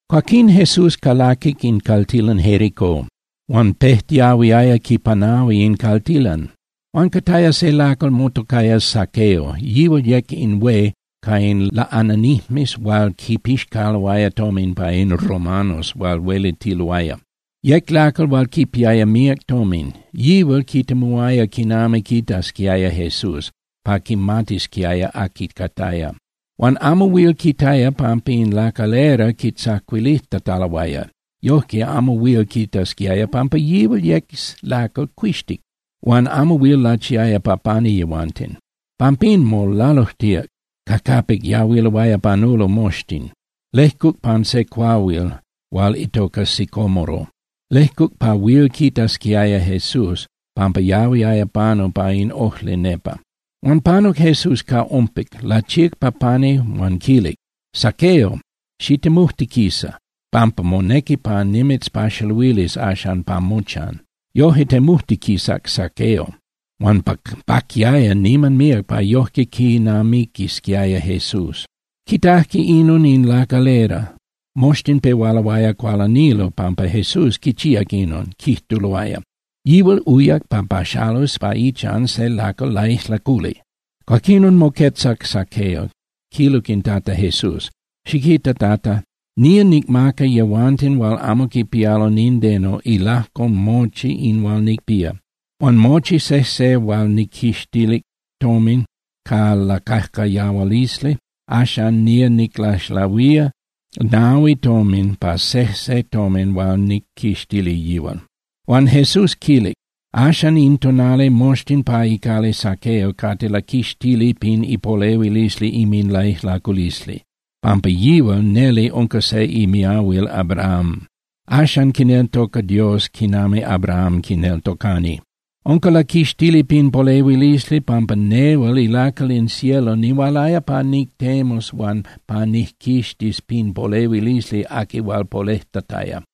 Cuaquín Jesús calaquic in caltilan Jericó, huan pejtiahuiaya quipanahui in caltilan. Huan cataya se lacal motocaya Zaqueo, yihual yec in hué ca in laꞌananijmes hual quipixcaloaya tomin pa in romanos hual huelitiloaya. Yec lacal hual quipiaya míac tomin. Yihual quitemuaya quinami quitasquiaya Jesús pa quimatisquiaya aqui cataya. Huan amo huil quitaya pampa in lacalera quitzacuilijtataloaya. Yojque amo huil quitasquiaya pampa yihual yec lacal cuixtic huan amo huil lachiaya pa pani yehuanten. Pampín molalujtíac ca capic yahuiloaya panulo moxtin. Lejcuc pan se cuahuil hual itoca sicómoro, lejcuc pa huil quitasquiaya Jesús, pampa yahuiaya panu pa in ojli nepa. Huan panuc Jesús ca ompic, lachíac pa pani huan quilic: —Zaqueo, xitemujtiquisa, pampa monequi pa nimitzpaxaluilis axan pa mochan. Yoje temujtiquisac Zaqueo, huan paquiaya niman míac pa yoje quinamiquisquiaya Jesús. Quitajque inon in lacalera, moxtin pehualoaya cualanilo pampa Jesús quichíac inon, quijtuloaya: —Yihual uyac pa paxalus pa ichan se lacal laijlaculi. Cuaquinon moquetzac Zaqueo, quilic in Tata Jesús: —Xiquita, Tata. Nía nicmaca yehuanten hual amo quipialo nindeno ilajco mochi in hual nicpía. Huan mochi sejse hual nijquixtilic tomin ca lacajcayahualisli, axan nía niclaxlahuía nahui tomin pa sejse tomin hual nijquixtilic yihual. Huan Jesús quilic: —Axan in tonali moxtin pa icali Zaqueo cate laquixtili pin ipolehuilisli inminlaijlaculisli, pampa yihual neli unca se imiahuil Abrahám. Axan quineltoca Dios quinami Abraham quineltocani. Unca laquixtili pin polehuilisli pampa nehual ilacal in cielo nihualaya pa nictemus huan pa nijquixtis pin polehuilisli aqui hual polejtataya.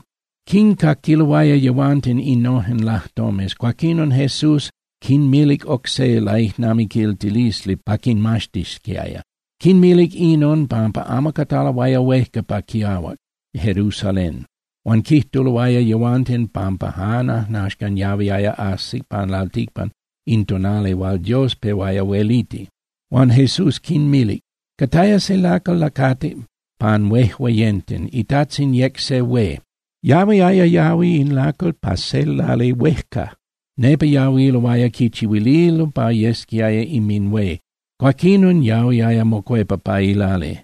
Quincaquiloaya yehuanten innojen lajtomes, cuaquinon Jesús quinmilic oc se laijnamiquiltilisli pa quinmaxtisquiaya. Quinmilic inon pampa amo cataloaya huejca pa quiahuac Jerusalén, huan quijtuloaya yehuanten pampa jan ajnaxcan yahuiaya ajsi pan lalticpan in tonali hual Dios pehuaya hueliti. Huan Jesús quinmilic: —Cataya se lacal lacatic pan huejueyenten, itajtzin yec se hué. Yahuiaya yahui in lacal pa se lali huejca, nepa yahuiloaya quichihuililo pa yesquiaya inminhué, cuaquinon yahuiaya mocuepa pa ilali.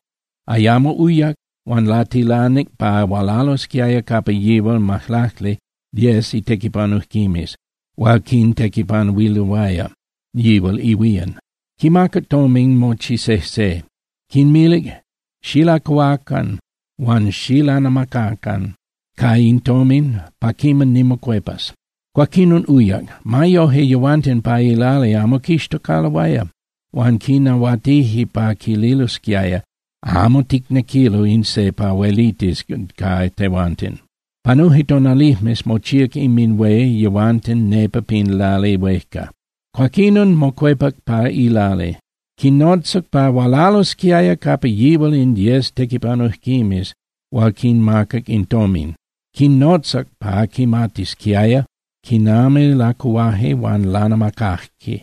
Ayamo uyac, huan latilanic pa hualalosquiaya capa yihual majlacli (diez) itequipanujquimes hual quitequipanuililoaya yihual ihuían. Quimacac tomin mochi sejse, quinmilic: “Xilacuhuacan huan xilanamacacan ca in tomin pa quiman nimocuepas.” Cuaquinon uyac. Ma yoje, yehuanten pa ilali amo quixtocaloaya, huan quinahuatije pa quililosquiaya: “Amo ticnequilo in se pa huelitis ca tehuanten.” Panuje tonalijmes, mochíac inminhué yehuanten nepa pin lali huejca. Cuaquinon, mocuepac pa ilali, quinnotzac pa hualalosquiaya capa yihual in diez tequipanujquimes hual quinmacac in tomin. Quinnotzac pa quimatisquiaya quinami lacuhuaje huan lanamacaje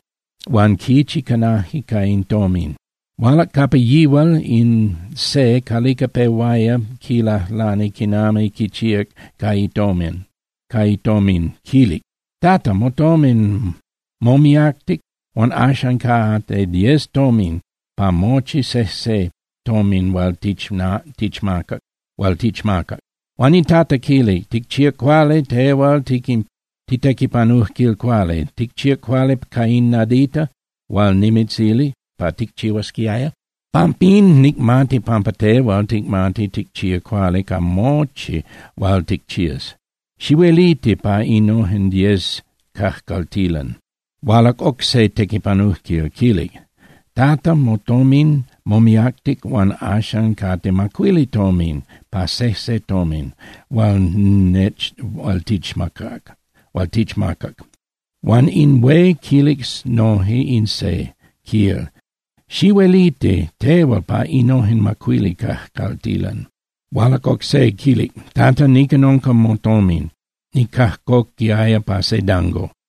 huan quichi canaje ca in tomin. Hualac capa yihual in se calica pehuaya quilajlani quinami quichíac ca itomin, quilic: “Tata, motomin momiactic huan axan cate diez tomin pa mochi sejse tomin hual tichmacac.” Huan in Tata quilic: “Ticchíac cuali, tehual titequipanujquil cuali. Ticchíac cuali ca in nadita hual nimitzilic pa ticchihuasquiaya. Pampín, nicmati pampa tehual ticmati ticchía cuali ca mochi hual ticchías. Xihueliti pa innojen diez cajcaltilan.” Hualac oc se tequipanujquil, quilic: “Tata, motomin momiactic huan axan cate macuili tomin pa sejse tomin hual tichmacac.” Huan in hué quilic noje in se, quil: “Xihueliti tehual pa innojen macuili cajcaltilan.” Hualac oc se, quilic: “Tata, nican unca motomin, nicajcoquiaya pa se dango.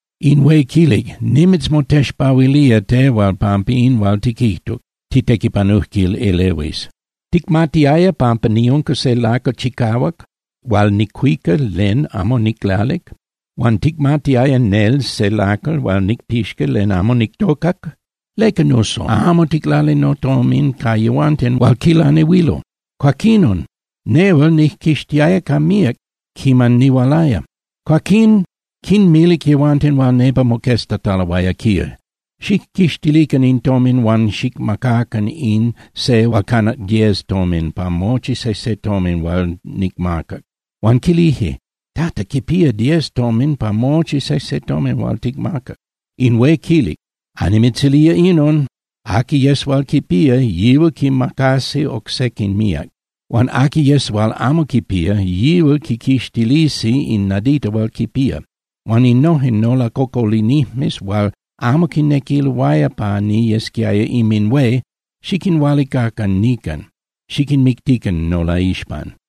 In hué quilic: “Nimitzmotexpahuilía tehual pampa in hual tiquijtuc, titequipanujquil elehuis. Ticmatiaya pampa niunca se lacal chicahuac hual nicuica len amo niclalic. Huan ticmatiaya nel se lacal hual nicpixca len amo nictocac. ¿Leca, nuso, amo ticlalic notomin ca yehuanten hual quilanehuilo? Cuaquinon nehual nijquixtiaya ca míac quiman nihualaya.” Cuaquín quinmilic yehuanten hual nepa moqueztataloaya, quil: “Xijquixtilican in tomin huan xicmacacan in se hual canac diez tomin pa mochi sejse tomin hual nicmacac.” Huan quilije: “Tata, quipía diez tomin pa mochi sejse tomin hual ticmacac.” In hué quilic: “Annimitzilía inon. Aqui yes hual quipía, yihual quimacasi oc sequin míac. Huan aqui yes hual amo quipía, yihual quiquixtilisi in nadita hual quipía. Huan innojen nolacocolinijmes hual amo quinequiloaya pa niyesquiaya inminhué, xiquinhualicacan nican, xiquinmictican nolaixpan.”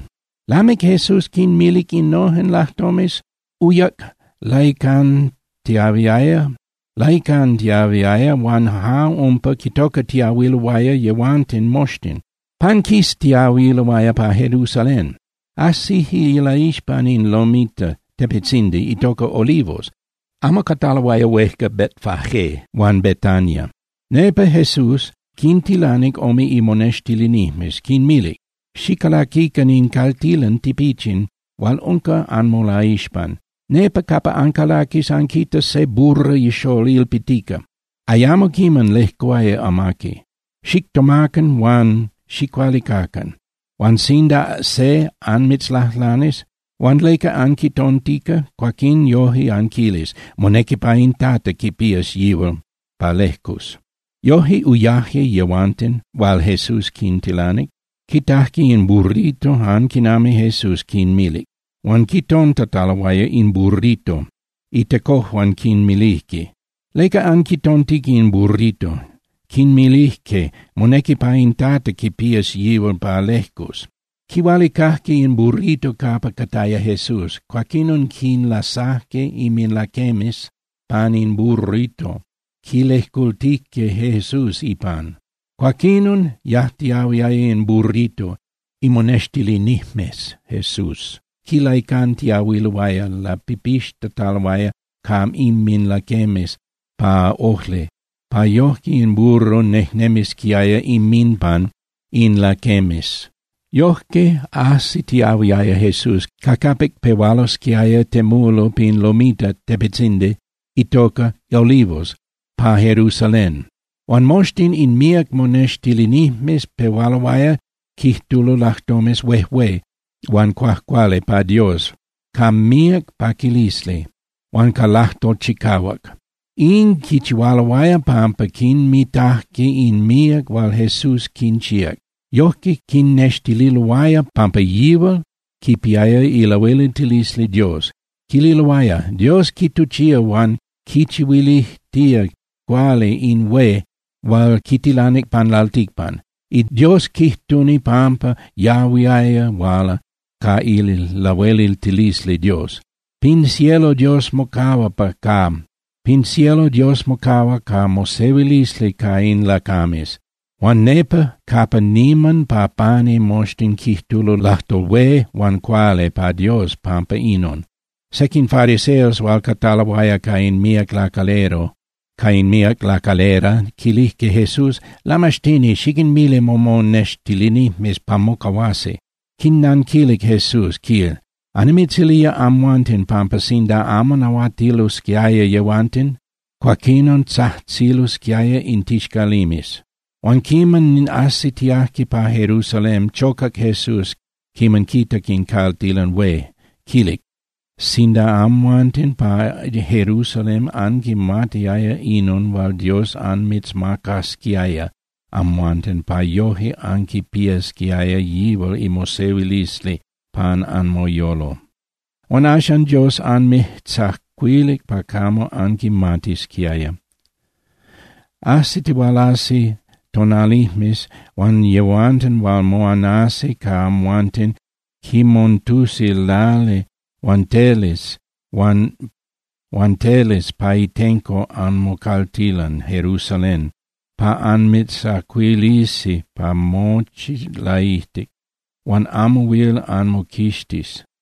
Lamic Jesús quinmilic innojen lajtomes, uyac laicantiahuiaya huan ja umpa quitocatiahuiloaya yehuanten moxtin, panquistiahuiloaya pa Jerusalén. Ajsijque ilaixpan in lomita (tepetzindi) itoca Olivos, amo cataloaya huejca Betfagé huan Betania. Nepa Jesús quintilanic ome imonextilinijmes, quinmilic: —Xicalaquican in caltilan tipichin hual unca anmolaixpan. Nepa capa ancalaquis, anquitas se burra ixól ilpitica, ayamo quiman lejcuaya amaqui. Xictomacan huan xicualicacan. Huan sinda se anmitzlajlanis: “Huan ¿leca anquitontica?” cuaquín yoje anquilis: “Monequi pa in Tata quipías yihual pa lejcus.” Yoje uyaje yehuanten hual Jesús quintilanic, quitajque in burrito jan quinami Jesús quinmilic. Huan quitontataloaya in burrito, itecojuan quinmilijque: —¿Leca anquitontica in burrito? Quinmilijque: —Monequi pa in Tata quipías yihual pa lejcus. Quihualicajque in burrito capa cataya Jesús. Cuaquinon quinlasajque inminlaquemes pani in burrito, quilejcultijque Jesús ipan. Cuaquinon yajtiahuiaya in burrito, imonextilinijmes Jesús quilaicantiahuiloaya lapipixtitataloaya ca inminlaquemes pa ojli pa yoje in burro nejnemisquiaya inminpan in laquemes. Yojque ajsitiahuiaya Jesús ca capic pehualosquiaya temulo pin lomita (tepetzindi) itoca Olivos pa Jerusalén. Huan moxtin in míac monextilinijmes pehualoaya quijtulo lajtomes huejué huan cuajcuali pa Dios ca míac paquilisli huan ca lajtol chicahuac. In quichihualoaya pampa quinmitajque in míac hual Jesús quinchíac, yojque quinnextililoaya pampa yihual quipiaya ilahueliltilisli Dios. Quililoaya: —¡Dios quituchía huan quichihuilijtía cuali in hué hual quitilanic pan lalticpan! ¡Dios quijtuni pampa yahuiaya huala ca ilahueliltilisli Dios! ¡Pin cielo Dios mocahua ca mosehuilisli ca in lacames! ¡Huan nepa capa niman pa pani moxtin quijtulo lajtol hué huan cuali pa Dios pampa inon! Sequin fariseos hual cataloaya ca in míac lacalera quilijque Jesús: —Lamaxtini, xiquinmili momonextilinijmes pa mocahuasi. Quinnanquilic Jesús, quil: —Annimitzilía amhuanten pampa sinda amo nahuatilosquiaya yehuanten, cuaquinon tzajtzilosquiaya in tixcalimes. Huan quiman ajsitiajque pa Jerusalén, chocac Jesús quiman quitac in caltilan hué, quilic: —¡Sinda amhuanten pa Jerusalén anquimatiaya inon hual Dios anmitzmacasquiaya amhuanten pa yoje anquipiasquiaya yihual imosehuilisli pan anmoyolo! Huan axan Dios anmijtzacuilic pa camo anquimatisquiaya. Ajsitihualasi tonalijmes huan yehuanten hual moanasi ca amhuanten quimontusi lali huan teles pa itenco anmocaltilan Jerusalen pa anmijtzacuilisi pa mochi laijtic, huan amo huil anmoquixtis.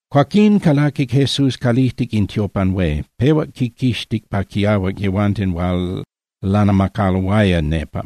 Cuaquín calaquic Jesús calijtic in tiopan hué, pehuac quinquixtic pa quiahuac yehuanten hual lanamacaloaya nepa.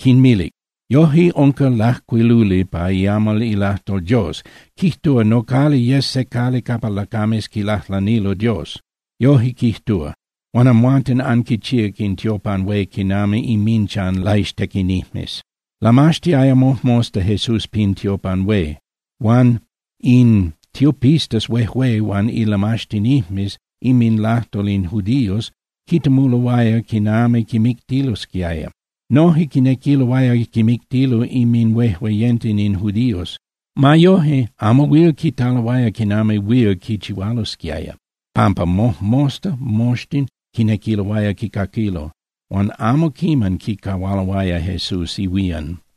Quinmilic: —Yoje unca lajcuiluli pa iamal ilajtol Dios, quijtúa: “Nocali yes se cali capa lacames quilajlanilo Dios.” Yoje quijtúa. Huan amhuanten anquichíac in tiopan hué quinami inminchan laixtequinijmes. Lamaxtiaya mojmosta Jesús pin tiopan hué. Huan in tiopistas huejué huan ilamaxtinijmes inminlajtol in judíos quitemuloaya quinami quimictilosquiaya. Noje quinequiloaya quimictilo inminhuejueyenten in judíos. Ma yoje, amo huil quitaloaya quinami huil quichihualosquiaya, pampa mojmosta moxtin quinequiloaya quicaquilo, huan amo quiman quicahualoaya Jesús ihuían.